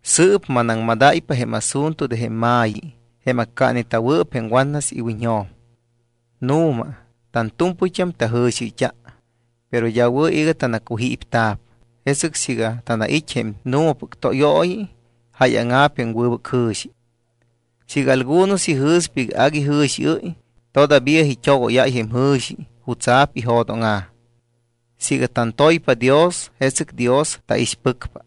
Sɨɨp manaŋmadáypa jém asunto de jém ma̱yi jém accaaneta̱wɨɨp jém watnas iwiñjo̱m. Nu̱ma tantu̱mpɨyt́am tajɨ̱xiɨyt́a, pero d́a wɨ̱ iga tanacujípta̱p. Jesɨc siiga tanait́ jém nu̱mapɨc tóyooyi, jáyaŋa̱p jém wɨbɨc jɨ̱xi. Siiga algunos ijɨ̱spa iga agui jɨ̱xiɨ́y, todavía it́ogóyáy jém jɨ̱xi jutsa̱p ijo̱dóŋa̱. Siiga tantoypa Dios, jesɨc Dios taixpɨcpa.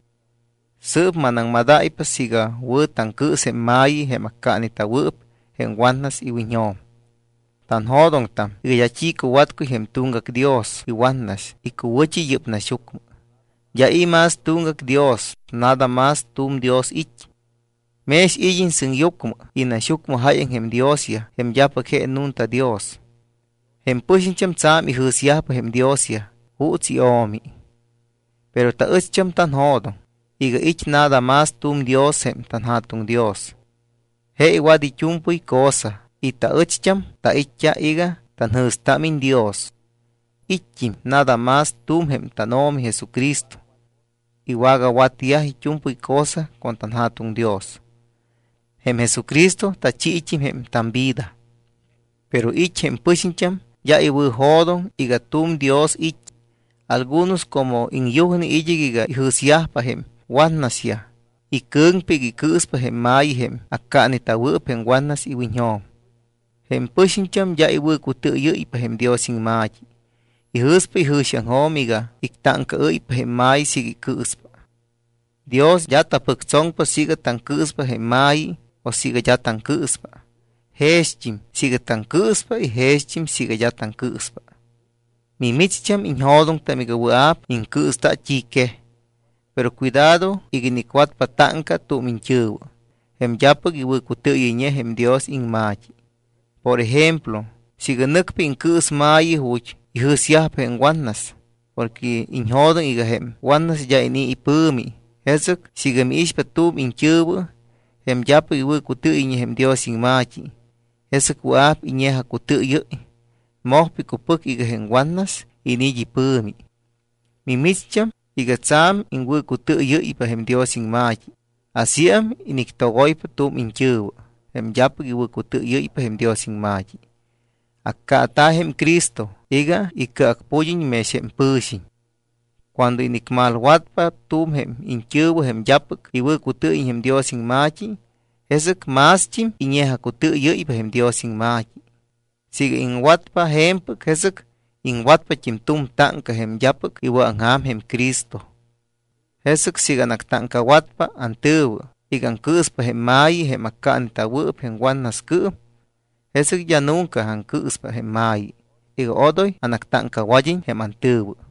Sɨɨp manaŋmadáypa siiga wɨ̱ taŋcɨɨs jém ma̱yi, jém accaaneta̱wɨɨp jém watnas iwiñjo̱m. Tanjo̱doŋtam iga d́a t́i cuwatcuy jém tuŋgac dios iwatnas icuwɨ̱t́i yɨ́p naxyucmɨ. D́a i̱ más tuŋgac Dios. Nada más tu̱m Dios it́. Mex id́iñ sɨŋyucmɨ y naxyucmɨ jáyaŋ jém diosyaj jém d́apɨc je nunta Dios. Jém pɨxiñt́am tsa̱m ijɨ̱syajpa jém diosyaj juuts io̱mi. Pero taɨcht́am tanjo̱doŋ iga it́ nada más t́u̱m Dios jém tanJa̱tuŋ Dios. Je iwat it́u̱mpɨy cosa y taɨcht́am tait́t́a iga tanjɨ̱stámiñ Dios. It́t́im nada más tu̱m jém tánO̱mi Jesucristo. Iwagawatyaj it́u̱mpɨy cosa con tanJa̱tuŋ Dios. Jém Jesucristo tachiit́im jém tamvida. Pero it́ jém pɨxiñt́am d́a iwɨ̱jo̱doŋ iga tu̱m Dios it́. Algunos como iŋyujne id́ɨc iga ijɨ̱syajpa jém watnasyaj, icɨ̱ŋpa iga icɨɨspa jém ma̱yi jém accaaneta̱wɨɨp jém watnas iwiñjo̱m. Jém pɨxiñt́am d́a iwɨ̱cutɨɨyɨ́ypa jém Dios iŋma̱t́i. Ijɨ̱spa ijɨ̱xiaŋjo̱m iga ictáŋcaɨ́ypa jém ma̱yi iga icɨɨspa. Dios d́a tapɨctsoŋpa siiga taŋcɨɨspa jém ma̱yi o siiga d́a taŋcɨɨspa. Jext́im siiga taŋcɨɨspa y jext́im siiga d́a taŋcɨɨspa. Mimicht́am iñjo̱doŋtam iga wɨa̱p iŋcɨɨsta t́i quej. Pero cuidado iga inicwatpa táŋca tu̱m iñt́ɨ̱wɨ, jém d́apɨc iwɨ̱cutɨɨyɨyñe jém Dios iŋma̱t́i. Por ejemplo, siiga nɨcpa iŋcɨɨs ma̱yi ju̱t́ ijɨ̱syajpa jém watnas porque iñjo̱doŋ iga jém watnas d́a inii̱ ipɨ̱mi, jesɨc siiga miixpa tu̱m iñt́ɨ̱wɨ, jém d́apɨc iwɨ̱cutɨɨyɨyñe jém Dios iŋma̱t́i, jesɨc wɨa̱p iñe̱jacutɨɨyɨ́y, mojpa icupɨc iga jém watnas iniit́ ipɨ̱mi. Mimicht́am iga tsa̱m iŋwɨ̱cutɨɨyɨ́ypa jém Dios iŋma̱t́i, asíam inictogoypa tu̱m iñt́ɨ̱wɨ, jém d́apɨc iwɨ̱cutɨɨyɨ́ypa jém Dios iŋma̱t́i. Accaata̱ jém Cristo iga icɨacpud́iñt́im mex jém pɨ̱xiñ. Cuando inicmalwatpa tu̱m jém iñt́ɨ̱wɨ jém d́apɨc iwɨ̱cutɨɨyɨyñe jém Dios iŋma̱t́i, jesɨc mást́im iñe̱jacutɨɨyɨ́ypa jém Dios iŋma̱t́i. Siiga iŋwatpa je̱mpɨc, jesɨc iŋwatpat́im tu̱m táŋca jém d́apɨc iwɨ̱aŋja̱m jém Cristo. Jesɨc siiga anactáŋcawatpa antɨ̱wɨ iga aŋcɨɨspa jém ma̱yi jém accaaneta̱wɨɨp jém watnascɨɨm, jesɨc d́a nunca aŋcɨɨspa jém ma̱yi iga odoy anactáŋcawad́iñ jém antɨ̱wɨ.